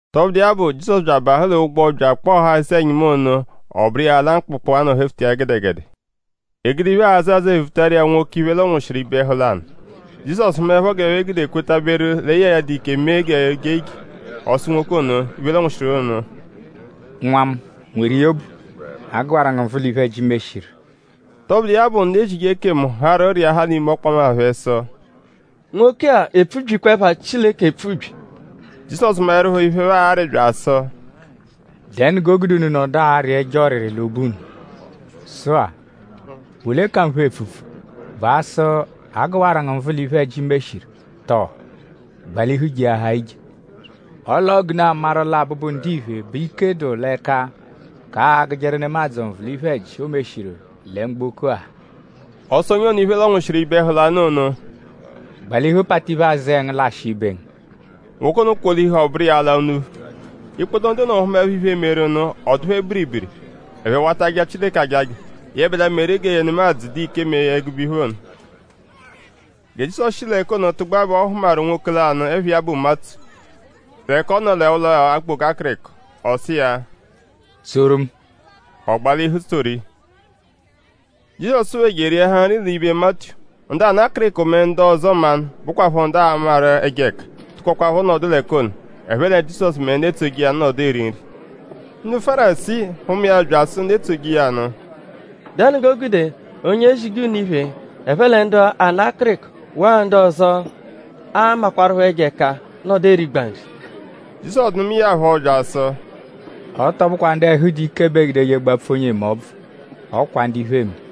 Tọbudu iya bụ; Jizọsu bya abahụ l'ụgbo bya akpọghaa eze-ẹnyimu ono; ọ bụru iya ala mkpụkpu, a nọ hefuta iya gẹdegede. E gude iphe, aazẹ azẹe vutaru iya nwoke, iphe lọnwushiru ibe ẹhu lanụ. Jizọsu hụmaepho g'ẹphe gude kwetaberu lẹ ya a-dụ ike mee g'o jee ije; ọ sụ nwoke ono, iphe lọnwushiru ono: “Nwa mu; nweru iya obu. A gụwaru ngu nvụ l'iphe-ẹji, i meshiru.” Tọbudu iya bụ; ndu ezije ekemu harụ rịahaa l'ime ọkpoma phẹ sụ: “Nwoke-a epfubyikwa ẹpha Chileke epfubyi.” Jizọsu maẹrupho iphe, ẹphe arị bya asụ: “?Dẹnu g'o gude unu nọdu arị ẹjo ọriri l'obu unu? Sụ-a;?bụ ole ka nphe epfupfu??Bụ asụ: ‘A gụwaru ngu nvụ l'iphe-ẹji, i meshiru?’?Tọo: ‘Gbalihu jeahaa ije?’ Ọle ọo g'unu a-maru lẹ Abụbu-Ndiphe bẹ ike dụ l'ẹka k'agụjeru nemadzụ nvụ l'iphe-ẹji, o meshiru lẹ mgboko-a.” Ọ sụ onye ono, iphe lọnwushiru ibe ẹhu lanụ ono: “Gbalihu palita iphe-azẹe ngu lashịa ibe ngu.” Nwoke ono kwolihu; ọ bụru iya ala unuphu. Ikpoto ndu ono hụmaepho iphe, meru nụ; ọ dụ phẹ biribiri. Ẹphe wata aja Chileke ajaja; yẹbedua meru gẹ nemadzụ dụ ike mee ẹgube iphe ono. Gẹ Jizọsu shi l'ẹka ono tụgbua bẹ ọ hụmaru nwoke lanụ, ẹpha iya bụ Matiyu; l'ẹka ọ nọ l'ụlo okpoga akịriko. Ọ sụ iya: “Tsoru mu.” Ọ gbalihu tsoru iya. Jizọsu phẹ je eriahaa nri l'ibe Matiyu. Ndu ana akịriko mẹ ndu ọzo mmanụ, bụkwapho ndu aamaru ẹjo ẹka tụkokwapho nọdu l'ẹka ono; ẹphe lẹ Jizọsu mẹ ndu etsoje iya nụ nọdu eri nri. Ndu Fárisii hụma iya bya asụ ndu etsoje iya nụ: “?Dẹnu g'o gude onye ezije unu iphe, ẹphe lẹ ndu ana akịriko; waa ndu ọzo, aamakwarụpho ẹjo ẹka nọdu erigba nri?” Jizọsu nụmae ya phọ bya asụ: “Ọ tọ bụkwa ndu ẹhu dụ ike bẹ eegudeje gbapfu onye eme ọbvu; ọ kwa ndu iphe eme.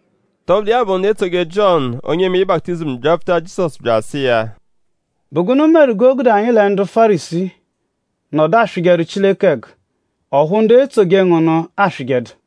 Tọbudu iya bụ; ndu etsoje Jiọnu onye emeje baputizimu byapfuta Jizọsu bya asụ iya: “?Bụ gụnu meru g'o gude anyi lẹ ndu Fárisii nọdu aswịjeru Chileke ẹgu; ọphu ndu etsoje ngu nụ aswịjedu?”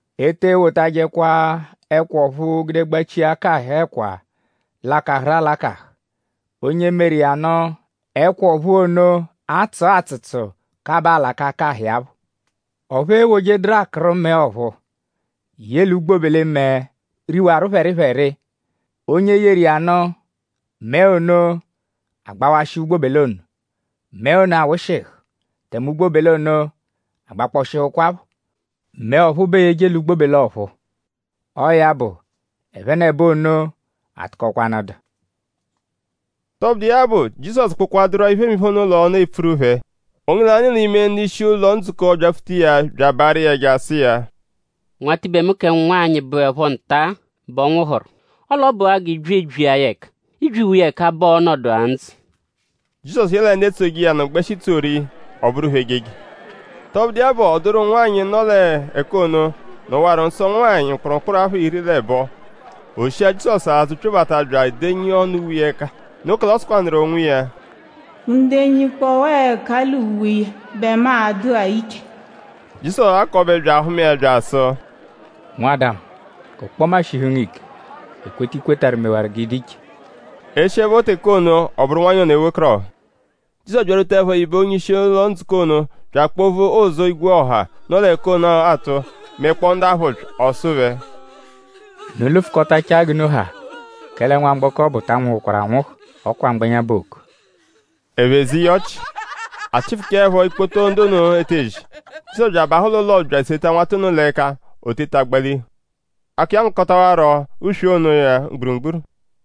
“E te ewotajẹkwa ẹkwa ọ̀phúú gude gbachia ẹka akahụ ẹkwa lakahụru alakahụ. Onye meru iya nụ; ẹkwa ọ̀phúú ono atsụa atsụtsu kabaa alaka akahụ iya phọ. Ọphu eewojeduru akụru mẹe ọ̀phúú ye l'ugbobele-mẹe, riwaru phẹripheri. Onye yeru iya nụ; mẹe ono agbawashịa ugbobele ono. Mẹe ono awụshihu; tẹme ugbobele ono agbakpọhukwapho. Mẹe ọ̀phúú bẹ eeyeje l'ugbobele ọ̀phúú. Ọo ya bụ; ẹphenebo ono atụkokwanu dụ.” Tọbudu iya bụ; Jizọsu kpụkwaduru-a iphemiphe ono l'ọnu epfuru phẹ; onye lanụ l'ime ndu-ishi ụlo-ndzukọ byapfuta iya bya abaarụ iya ẹja sụ iya: “Nwatibe mu kẹ nwanyị bụepho nta-a bẹ ọ nwụhuru. Ọle ọ bụa g'ị bya ebyia ya ẹka. I -byiwa iya ẹka bẹ ọo-nọdu-a ndzụ.” Jizọsu yẹle ndu etsoje iya nụ gbẹshi tsoru iya; ọ bụru phẹ ejeje. Tọbudu iya bụ; ọ dụru nwanyị, nọ l'ẹka ono, nọwaru nsọ ụnwanyi mkpụrumkpuru apha iri l'ẹbo. O shia Jizọsu azụ pyobata bya edenyi ọnu uwe iya ẹka. Noo kẹle ọ sụkwanuru onwiya: “Mu -denyikpọwaa ẹka l'uwe iya bẹ mu a-dụa iche.” Jizọsu ghakọbe bya ahụma iya bya asụ: “Nwada mu; g'ọkpoma shihu ngu ike. Ekweta, i kwetarụ mewaru g'ị dụ iche.” E shiẹpho teke ono; ọ bụru nwanyị ono ewekọrohu. Jizọsu byarwutaẹpho ibe onye-ishi ụlo-ndzukọ ono bya akpovu ụzu, igwe ọha, nọ l'ẹka ono atụ; mẹkpoo ndu aphụ ụpyi. Ọ sụ phẹ: “Unu lụfukotachaa g'unu ha. Kẹle nwamgbọko ọbu ta anwụhukwaru anwụhu. Ọ kwa mgbẹnya bẹ ooku.” Ẹphe ze iya ọchi. A chịfuchaepho ikpoto ndu ono etezi; Jizọsu bya abahụ l'ụlo bya eseta nwata ono l'ẹka. O teta gbalihu. Akọ iya ngakọtawaro uswe iya onoya mgburugburu.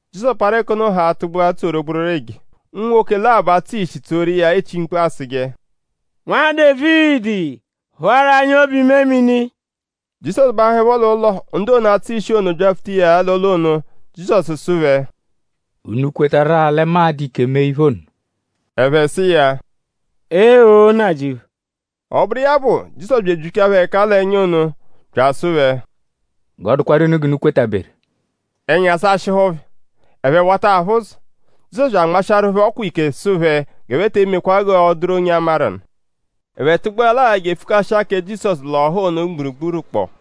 Jizọsu parụ ẹka ono haa tụgbua tsoru gbororo eje. Unwoke labọ, atsụ ishi tsoru iya echi mkpu asụje: “Nwa Dévidi; phụaru anyi obu-imemini!” Jizọsu bahụepho l'ụlo; ndu ono, atsụ ishi ono byapfuta iya l'ụlo ono. Jizọsu sụ phẹ: “?Unu kwetarụ-a lẹ mu a-dụ ike mee iphe ono?” Ẹphe sụ iya: “Ee-o! Nnajịuphu.” Ọ bụru iya bụ; Jizọsu bya ebyichaa phẹ ẹka l'ẹnya ono; bya asụ phẹ: “G'ọ dụkwaru unu g'unu kwetaberu.” Ẹnya sashịhu phẹ. Ẹphe wata aphụ ụzo. Jizọsu bya anmashịaru phẹ ọkwa ike sụ phẹ g'ẹphe te emekwa g'ọ dụru onye a-maru nụ. Ẹphe tụgbuelaa je epfukashia kẹ Jizọsu l'ọha ono mgburugburu kpọ.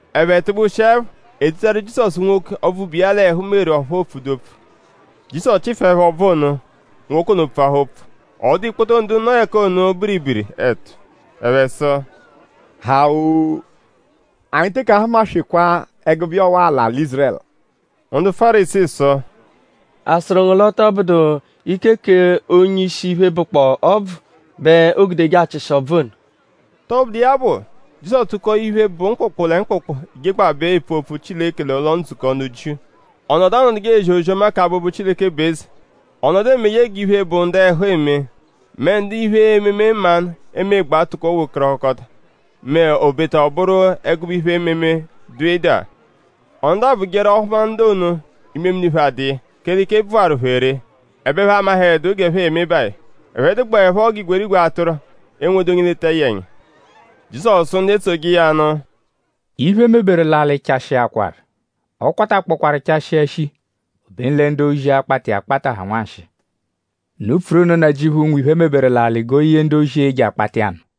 Ẹphe tụgbushiepho; e dutaru Jizọsu nwoke, ọbvu bu iya l'ẹhu meru ọphu o pfudu opfu. Jizọsu chịfuepho ọbvu ono; nwoke ono pfuahaa opfu. Ọ dụa ikpoto ndu nọ l'ẹka ono biribiri ẹtu. Ẹphe sụ: “Ha-oo! Anyi teke ahụma-swekwaa ẹgube iya ọwa-a l'alị Ízurẹlu!” Ndu Fárisii sụ: “?A sụru ngu l'ọ tọ bụdu ike k'onye-ishi iphe, bụkpoo ọbvu bẹ oogudeje achịshi ọbvu ono.” Tọbudu iya bụ; Jizọsu tụko iphe, bụ mkpụkpu lẹ mkpụkpu jegbabẹ epfu opfu Chileke l'ụlo-ndzukọ ndu Jiu. Ọ nọdu anọduje ezi ozi-ọma k'abụbu Chileke bụ eze. Ọ nọdu emeje g'iphe, bụ ndu ẹhu eme mẹ ndu iphe-ememe mmanụ emegbaa tụko wekọrohukota m'obeta ọ bụru ẹgube iphe-ememe, dụ ịdagha. Ọ nọdu abụjeru; ọ -hụma ndu ono; imemini phẹ adụ iya; kẹle ike bvụwaru phẹ ree; ẹbe ẹphe amahẹdu g'ẹphe e-me iya. Ẹphe dụgbaepho g'igwerigwe atụru, enwedu onye eleta iya ẹnya. Jizọsu sụ ndu etsoje iya nụ: “Iphe, e meberu l'alị chashịakwaru. Ọ kwatakpọkwaru chashịa shii. Obenu lẹ ndu-ozi, akpata iya akpata ha nwanshịi. Unu pfuru nụ Nnajịuphu, nwe iphe, e meberu l'alị g'o ye ndu-ozi, e-je akpata iya nụ.”